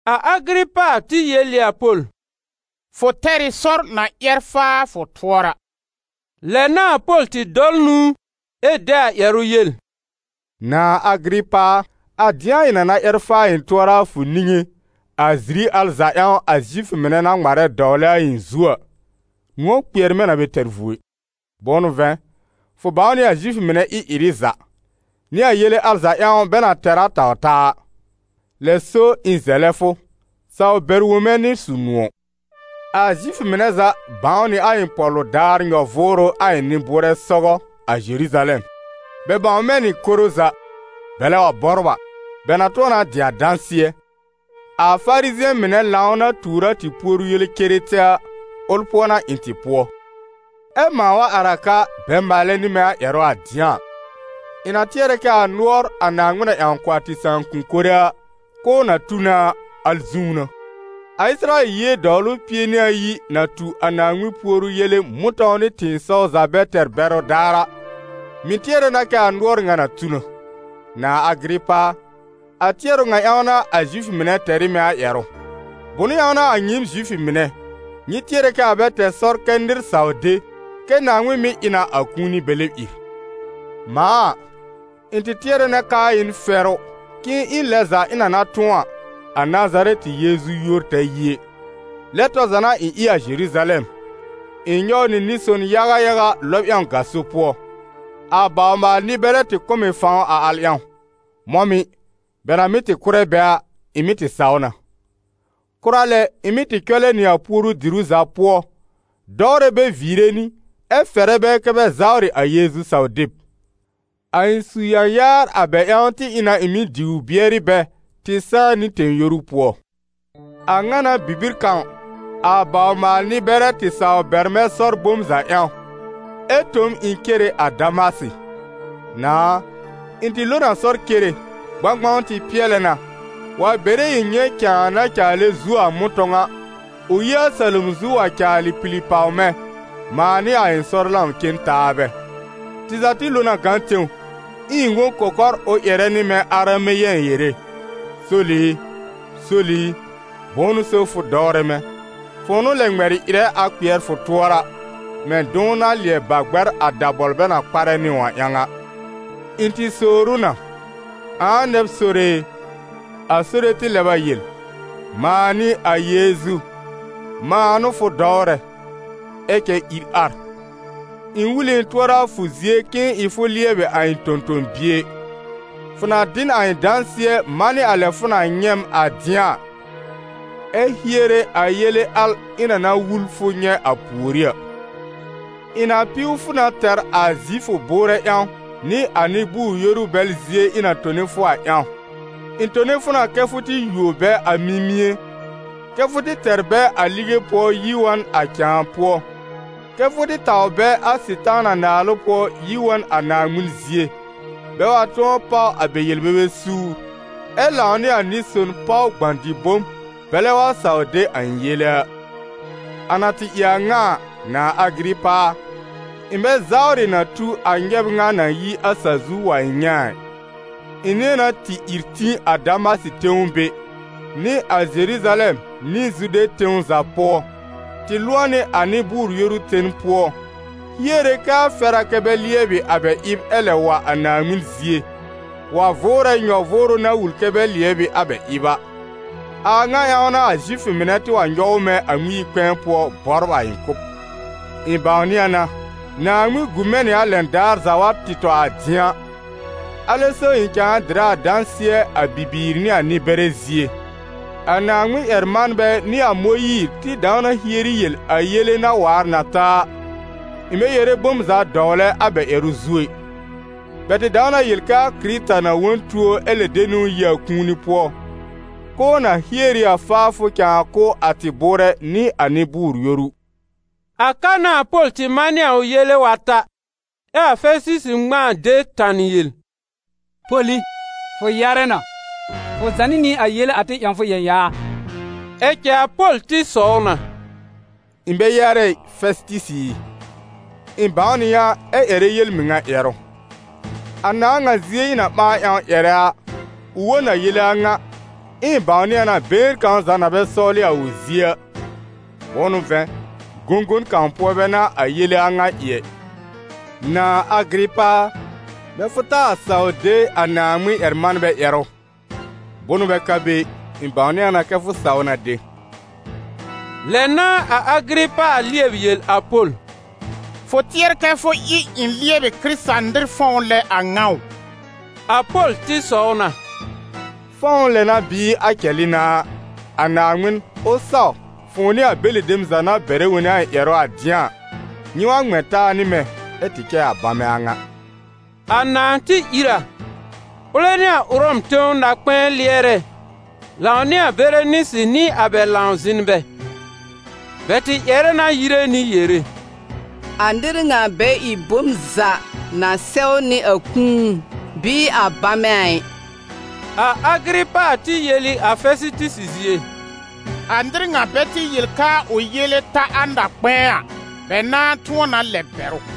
A Agɩrɩpa tɩ yel ɩ a Pol: «Fʋ tɛr ɩ sɔr na ƴɛr faa fʋ tʋɔra.» Lɛ n'a a Pol tɩ dɔl nũu ɛ de a ƴɛrʋ yel: «Nãà Agɩrɩpa a, a dɩ̃a ɩ̃ na na ƴɛr faa ɩ̃ tʋɔra a fʋ niŋé, a ziri al za ƴãw a Zifʋ mɩnɛ na ŋmarɛ dɔwlɛ a ɩ̃ zu a, nʋ̃ɔ̀ kpɩɛr mɛ̃ na bɛ tɛr vuo ɩ. Bʋ̃ʋ n'ʋ vɛ̃, fʋ bãw nɩ a Zifʋ mɩnɛ ɩ-ɩrɩ za, nɩ a yele al za ƴãw bɛ na tɛr a taw-taa a. Lɛ so, ɩ̃ zɛlɛ fʋ, saw bɛr wõ mɛ̃ nɩ su-nʋ̃ɔ̀.» «A Zifʋ mɩnɛ za bãw nɩ a ɩ̃ pɔ̀lʋ daar nyɔ-vʋʋrʋ a ɩ̃ nɩ-bʋʋrɛ sɔgɔ, a Zeruzalɛm. Bɛ bãw mɛ̃ nɩ koro za, bɛlɛ wa bɔbr a, bɛ na tʋ̃ɔ na dɩ a dãsɩ̃ɛ, a Farizɩ̃ɛ mɩnɛ lãw na tuur a tɩ puoru yele ceretete a, ʋl pʋɔ n'a ɩ̃ tɩ pʋɔ. Ɛ mãa wa ar a ka bɛ maalɛ nɩ mɛ̃ ƴɛrʋ a dɩ̃a a, ɩ̃ na tɩɛrɛ kɛ a nʋɔr, a Naaŋmɩn na ƴãw kʋ̀ a tɩ sãakʋm mɩnɛ a, k'ʋʋ na tu na a, al zũú n'a. A Ɩsɩrayɛl yie dɔwlʋ pie nɩ ayi, na tu a Naaŋmɩn puoru yele mʋ̃tɔ̃w nɩ tɩ̃ɩsɔw za bɛ tɛr bɛrʋ daar a, mɩ̀ tɩɛrɛ na kɛ a nʋɔr ŋa na tu na. Nãà Agɩrɩpa a, a tɩɛrʋ ŋa ƴãw n'a a Zifʋ mɩnɛ tɛr ɩ mɛ̃ a ƴɛrʋ. Bʋ̃ʋ ƴãw n'a a nyɩɩm Zifʋ mɩnɛ, nyɩ tɩɛrɛ kɛ a bɛ tɛr sɔr kɛ nɩr saw de kɛ Naaŋmɩn mɩ́ ɩ na a kũuni bɛ lɛb ìr? Mãa a, ɩ̃ tɩ tɩɛrɛ na k'aa ɩ n fɛrʋ k'ɩ̃ɩ ɩ lɛn za ɩ̃ na na tʋ̃ɔ a, a Nazarɛtɩ Yeezu yúor ta yi ɛ. Lɛ tɔr za n'a ɩ̃ ɩ a Zeruzalɛm. Ɩ̃ nyɔw nɩ nɩ-son yaga yaga lɔb ƴãw gaso pʋɔ. A bawr-maal-nɩ-bɛrɛ tɩ kʋ̀ m ɩ fãw a al ƴãw. Mɔ̃ mɩ̀, bɛ na mɩ́ tɩ kʋ́rɛ bɛ a, ɩ̃ mɩ́ tɩ saw na. Kʋra lɛ, ɩ̃ mɩ́ tɩ cɔlɛ nɩ a puoru-diru za pʋɔ dɔwrɛ bɛ viire nɩ, ɛ fɛrɛ bɛ kɛ́ bɛ zawrɩ a Yeezu saw-deb. A ɩ̃ su-yãyaar a bɛ ƴãw tɩ ɩ na ɩ̃ mɩ́ diw bɩɛrɩ bɛ tɩ sãá nɩ tẽ-yoru pʋɔ.» «A ŋa n'a bibir kãw, a bawr-maal-nɩ-bɛrɛ tɩ saw bɛr mɛ̃ sɔr bom za ƴãw, ɛ tõ m ɩ̃ cere a Damasɩ. Nãà a, ɩ̃ tɩ lo n a sɔr cere, gbãgbãw tɩ pɩɛlɛ na, wa bere ɩ̃ nyɛ̃ cãa na caalɛ zuo a mʋ̃tɔ̃w a, ʋ yi a salom zu wa caalɩ pili pàw mɛ̃, mãa nɩ a ɩ̃ sɔr-lãw-cen-taabɛ. Tɩ za tɩ lo na gã tẽw, ɛ ɩ̃ wõ kɔkɔr ʋ ƴɛrɛ nɩ mɛ̃ arameyɛ̃ yere: ‹Sol i, Sol i, bʋ̃ʋ n'ʋ so fʋ dɔwrɛ mɛ̃? Fʋ̃ʋ n'ʋ lɛ ŋmɛlɩ ɩrɛ a kpɩɛr fʋ tʋɔra, mɛ̃ dʋ̃w na lɩɛb ba gbɛr a dabɔl bɛ na kparɛ nɩ ʋ a ƴãw a.› Ɩ̃ tɩ sowr ʋ na: ‹Ãa nɛ b Sore e?› A Sore tɩ lɛb a yel: ‹Mãa n'ɩ a Yeezu, mãa n'ʋ fʋ dɔwrɛ. Ɛ cɛ ìr ar. Ɩ̃ wul ɩ ɩ̃ tʋɔra a fʋ zie k'ɩ̃ɩ ɩ fʋ lɩɛbɩ a ɩ̃ tõ-tõ-bie. Fʋ na dɩ n a ɩ̃ dãsɩɛ manɩ a lɛ fʋ na nyɛ̃ m a dɩ̃a a, ɛ hiere a yele al ɩ̃ na na wul fʋ nyɛ̃ a pùorí a. Ɩ̃ na piw fʋ na tɛr a Zifʋ bʋʋrɛ ƴãw nɩ a nɩ-bʋʋr-yoru bɛl zie ɩ̃ na tone fʋ a ƴãw. Ɩ̃ tone fʋ na kɛ́ fʋ tɩ yuo bɛ a mimie, kɛ́ fʋ tɩ tɛr bɛ a lige pʋɔ yi wa n a cãa pʋɔ, kɛ́ fʋ tɩ taw bɛ a Sɩtaana naalʋ pʋɔ yi wa n a Naaŋmɩn zie, bɛ wa tʋ̃ɔ páw a bɛ yel-bebe suur, ɛ lãw nɩ a nɩ-son páw gbã-dɩ-bom, bɛlɛ wa saw de a ɩ̃ yele a.›» «A na tɩ ɩ a a ŋa a, nãà Agɩrɩpa a, ɩ̃ bɛ zawrɩ na tu a nyɛb ŋa na yi a sa-zu wa ɩ̃ nyɛ̃ a ɩ. Ɩ̃ nɩ̃ɛ na tɩ ìr tĩ a Damasɩ tẽw be, nɩ a Zeruzalɛm nɩ Zude tẽw za pʋɔ, tɩ lʋ̃ɔ nɩ a nɩ-bʋʋr-yoru ten pʋɔ, hiere kɛ a fɛr a kɛ́ bɛ lɩɛbɩ a bɛ ɩb ɛ lɛb wa a Naaŋmɩn zie, wa vʋʋrɛ nyɔ-vʋʋrʋ na wul kɛ́ bɛ lɩɛbɩ a bɛ ɩb a. A a ŋa ƴãw n'a Zifʋ mɩnɛ tɩ wa nyɔw mɛ̃ a Ŋmɩn-yi-kpɛ̃ɛ pʋɔ bɔbr a ɩ̃ kʋ́b. Ɩ̃ bãwnɩ a na, Naaŋmɩn gu mɛ̃ nɩ a lɛn daar za wa tɩ tɔ a dɩ̃a, alɛ so ɩ̃ cãa dɩrɛ a dãsɩɛ a bibiir nɩ a nɩ-bɛrɛ zie. A Naaŋmɩn-ƴɛr-manbɛ nɩ a Mõyiir tɩ dãw na hieri yel a yele na waar na ta a, ɩ̃ bɛ yere bom za dɔwlɛ a bɛ ƴɛrʋ zu ɛ. Bɛ tɩ dãw na yel kɛ a Kɩrɩta na wõ n tuo ɛ lɛb de niwn yi a kũuni pʋɔ, k'ʋʋ na hier ɩ a faafʋ cãa kʋ̀ a tɩ bʋʋrɛ nɩ a nɩ-bʋʋr-yoru.» A ka n'a a Pol tɩ manɩ a ʋ yele wa ta, ɛ a Fɛsɩtɩsɩ ŋmãa de tanɩ yel: «Pol i, fʋ yarɛ na! Fʋ zànɩ nɩ a yele a tɩ ƴãw fʋ yãyaar!» Ɛ cɛ a Pol tɩ sɔw na: «Ɩ̃ bɛ yarɛ ɩ, Fɛsɩtɩsɩ ɩ! Ɩ̃ bãw nɩ yã ɛ ƴɛrɛ yel-mɩŋa ƴɛrʋ. A nãà ŋa zie ɩ̃ na ɓãa ƴãw ƴɛrɛ a, ʋ wõ n a yele a ŋa, ɛ ɩ̃ bãwnɩ a na been kãw za na bɛ sɔwlɩ a ʋ zie a, bʋ̃ʋ n'ʋ vɛ̃, gõgon kãw pʋɔ bɛ n'a a yele a ŋa ɩ ɛ. Nãà Agɩrɩpa a, mɛ̃ fʋ taa saw de a Naaŋmɩn-ƴɛr-manbɛ ƴɛrʋ? Bʋnʋ bɛ ka be ɩ, ɩ̃ bãwnɩ a na kɛ fʋ saw na de.» Lɛ n'a a Agɩrɩpa lɩɛb yel a Pol: «Fʋ tɩɛr kɛ fʋ ɩ ɩ̃ lɩɛbɩ Kɩrɩta-nɩr fɔ̃w lɛ a ŋa ʋ?» A Pol tɩ sɔw na: «Fɔ̃w lɛ n'a bɩɩ a cɛlɩ n'a a, a Naaŋmɩn, ʋ saw fʋ̃ʋ nɩ a bɛlɩ dem za na bɛrɛ wone a ɩ̃ ƴɛrʋ a dɩ̃a a, nyɩ wa ŋmɛ̃ taa nɩ mɛ̃, ɛ tɩ cɛ a bamɛ a ŋa!» A nãà tɩ ìr a, ʋlɛ nɩ a Ʋrɔm tẽw na-kpɛ̃ɛ lɩɛrɛ lãw nɩ a Berenisɩ nɩ a bɛ lãw-zɩ̃nbɛ. Bɛ tɩ ƴɛrɛ na yire nɩ yere: «A nɩr ŋa bɛ ɩ bom za na sɛwnɩ a kũu bɩɩ a bamɛ ɩ.» A Agɩrɩpa tɩ yel ɩ a Fɛsɩtɩsɩ zie: «A nɩr ŋa bɛ tɩ yel k'aa ʋ yele ta a na-kpɛ̃ɛ a, bɛ na tʋ̃ɔ na lɛb bɛr ʋ.»